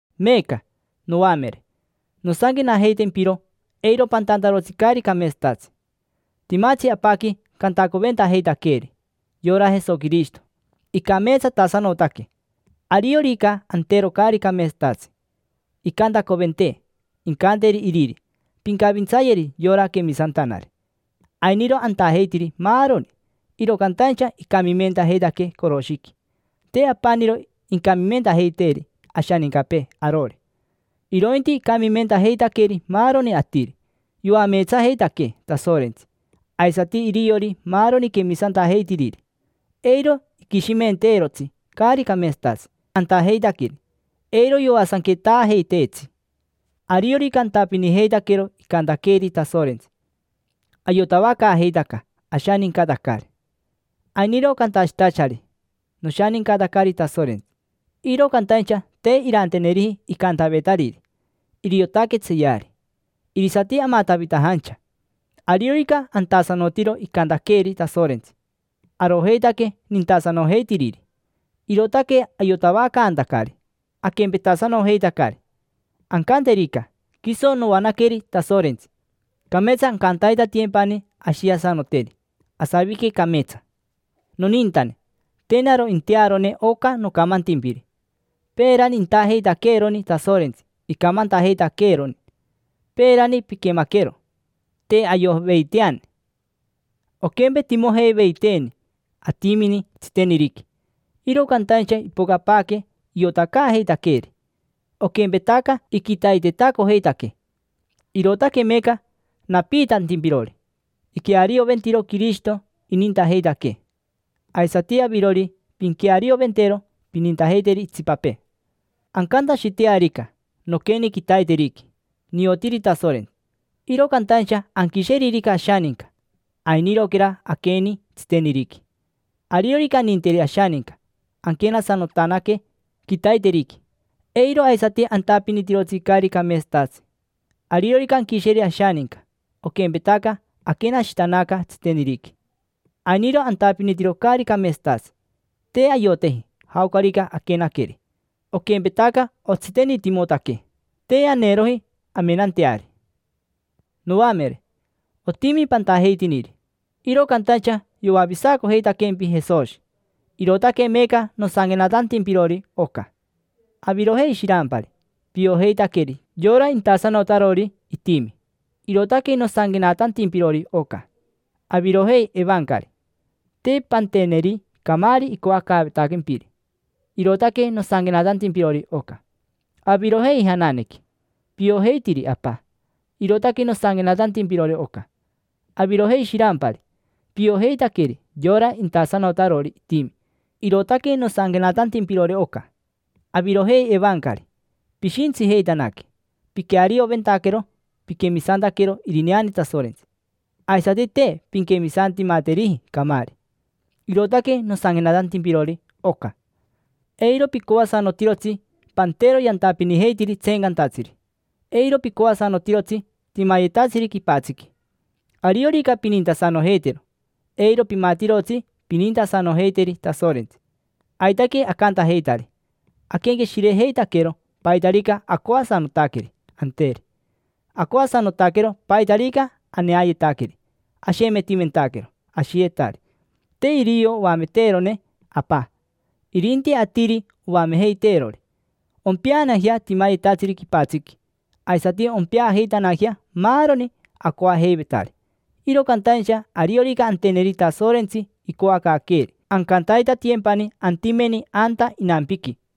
Meeca, noamere, nosanquenajeitempiro eiro pantantarotsi caari cameetsatatsi. Timatsi Apaqui Cantacoventajeitaqueeri: yora Jesoquirishito, icameetsatasanotaque. Ariorica antero caari cameetsatatsi, incantacoventee. Incanteri iriri: “Pincavintsayeri yora quemisantanari”. Ainiro antajeitiri maaroni, iro cantaincha icamimentajeitaquee coroshiqui. Te apaniro incamimentajeiteri ashanincapee arori, irointi icamimentajeitaqueri maaroni atiri. Yoameetsajeitaquee Tasorentsi, aisati iriori maaroni quemisantajeitiriri, eiro iquishimenteerotsi caari cameetsatatsi antajeitaqueri, eiro yoasanquetaajeiteetsi. Ariorica antapinijeitaquero icantaqueeri Tasorentsi, ayotavacaajeitaca ashanincatacari. Ainiro cantashitachari: “Noshanincatacari Tasorentsi”, iro cantaincha te iranteneriji icantavetariri. Iriotaque tseeyari, irisati amatavitajancha. Ariorica antasanotiro icantaqueeri Tasorentsi, arojeitaque nintasanojeitiriri. Irootaque ayotavacaantacari aquempetasanojeitacari. Ancanterica: “Quiso noanaqueri Tasorentsi”, cameetsa ancantaitatiyempani ashiasanoteri, asavique cameetsa. Nonintane, te naro intearone oca nocamantimpiri. Peerani intajeitaqueeroni Tasorentsi icamantajeitaqueeroni. Peerani piquemaquero. Te ayoveiteani, oquempetimojeiveiteeni atimini tsiteniriqui, iro cantaincha ipocapaaque iotacaajeitaqueeri, oquempetaca iquitaitetacojeitaquee. Irootaque meeca napiitantimpirori. Iquearioventiro Quirishito inintajeitaquee. Aisati avirori, pinquearioventero, pinintajeiteri itsipapee. Ancantashitearica: “Noqueni quitaiteriqui, niotiri Tasorentsi”, iro cantaincha anquisheririca ashaninca, ainiroquera aqueni tsiteniriqui. Ariorica aninteri ashaninca, anquenasanotanaque quitaiteriqui, eiro aisati antapinitirotsi caari cameetsatatsi. Ariorica anquisheri ashaninca, oquempetaca aquenashitanaca tsiteniriqui, ainiro antapinitiro caari cameetsatatsi. Te ayoteji jaocarica aquenaqueri, oquempetaca otsitenitimotaquee, te aneeroji amenanteari. Noamere, otimi pantajeitiniri, iro cantaincha yoavisacojeitaquempi Jesoshi. Irootaque meeca nosanquenatantimpirori oca. Avirojei shirampari: piojeitaqueri yora intasanotarori itimi, irootaque nosanquenatantimpirori oca. Avirojei, evancari: te panteneri camaari icoacaavetaquempiri, irootaque nosanquenatantimpirori oca. Avirojei jananequi: piojeitiri Apa, irootaque nosanquenatantimpirori oca. Avirojei shirampari: piojeitaqueri yora intasanotarori itimi, irootaque nosanquenatantimpirori oca. Avirojei evancari: pishintsijeitanaque, piquearioventaquero piquemisantaquero irineane Tasorentsi, aisati te pinquemisantimateriji camaari, irootaque nosanquenatantimpirori oca. Eiro picoasanotirotsi pantero yantapinijeitiri tseencantatsiri. Eiro picoasanotirotsi timayetatsiri quipatsiqui. Ariorica pinintasanojeitero, eiro pimatirotsi pinintasanojeiteri Tasorentsi. Aitaque acantajeitari: aquenqueshirejeitaquero paitarica acoasanotaqueri anteri. Acoasanotaquero paitarica aneayetaqueri, ashemetimentaquero ashiyetari. Te irio oameteerone Apa, irinti atiri oamejeiteerori. Ompeanajea timayetatsiri quipatsiqui, aisati ompeajeitanajea maaroni acoajeivetari. Iro cantaincha ariorica anteneri Tasorentsi icoacaaqueeri, ancantaitatiyempani antimeni anta inampiqui.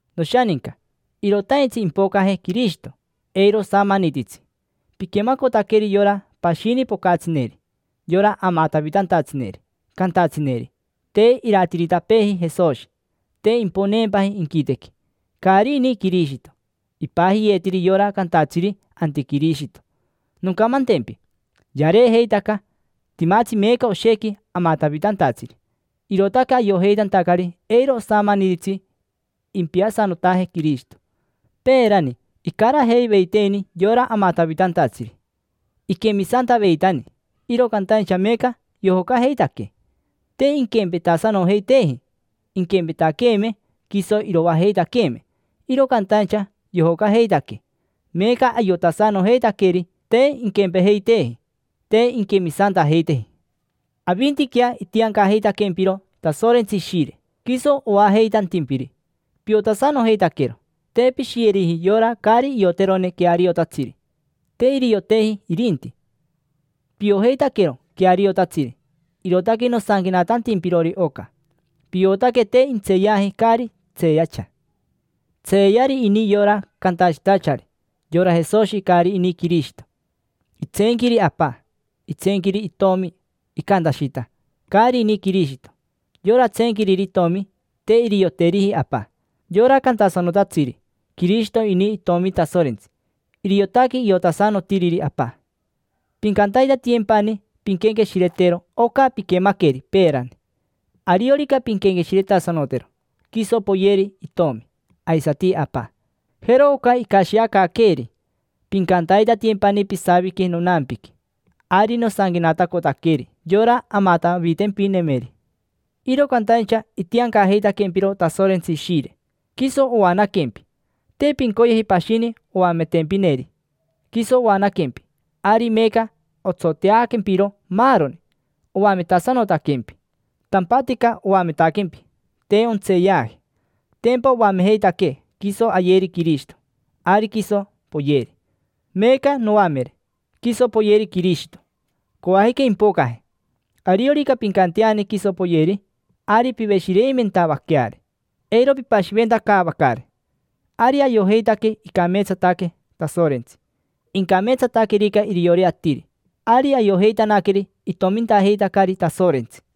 Noshaninca, irotaintsi impocaje Quirishito, eiro osamanititsi. Piquemacotaqueri yora pashini pocatsineri, yora amatavitantatsineri, cantatsineri: “Te iratiritapeeji Jesoshi, te imponeempaji inquitequi. Caari ini Quirishito”. Ipajiyeetiri yora cantatsiri: “Antiquirishito”. Noncamantempi, yareejeitaca. Timatsi meeca oshequi amatavitantatsiri, irootaque ayojeitantacari eiro osamanititsi impiasanotaje Quirishito. Peerani icarajeiveiteeni yora amatavitantatsiri, iquemisantaveitani, iro cantaincha meeca yojocajeitaquee. Te inquempetasanojeiteeji. Inquempetaqueeme, quiso iroajeitaqueeme, iro cantaincha yojocajeitaquee. Meeca ayotasanojeitaqueri te inquempejeiteeji, te inquemisantajeiteji. Avintiquea itiancajeitaquempiro Tasorentsi Ishire, quiso oajeitantimpiri. Piotasanojeitaquero. Te pishiyeriji yora caari ioterone queariotatsiri: te irioteji irinti. Piojeitaquero queariotatsiri, irootaque nosanquenatantimpirori oca. Piotaque te intseeyaji caari tseeyacha. Tseeyari ini yora cantashitachari: “Yora Jesoshi, caari ini Quirishito”. Itseenquiri Apa. Itseenquiri Itomi, icantashita: “Caari ini Quirishito”. Yora tseenquiriri Itomi, te irioteriji Apa. Yora cantasanotatsiri: “Quirishito ini Itomi Tasorentsi”, iriotaque iotasanotiriri Apa. Pincantaitatiyempani pinquenqueshiretero oca piquemaqueri peerani. Ariorica pinquenqueshiretasanotero, quiso poyeri Itomi, aisati Apa. Jero oca icashiacaaqueeri: “Pincantaitatiyempani pisavique nonampiqui”. Ari nosanquenatacotaqueri yora amatavitempinemeri, iro cantaincha itiancajeitaquempiro Tasorentsi Ishire, quiso oanaquempi. Te pincoyeji pashini oametempineri. Quiso oanaquempi, ari meeca otsoteaquempiro maaroni, oametasanotaquempi. Tampatica oametaquempi, te ontseeyaji. Tempa oamejeitaquee quiso ayeri Quirishito: ari quiso poyeri. Meeca, noamere, quiso poyeri Quirishito. Coajica impocaje. Ariorica pincanteani quiso poyeri, ari piveshireimentavaqueari, eiro pipashiventacaavacari. Ari ayojeitaque icameetsataque Tasorentsi. Incameetsataquerica iriori atiri, ari ayojeitanaqueri itomintajeitacari Tasorentsi.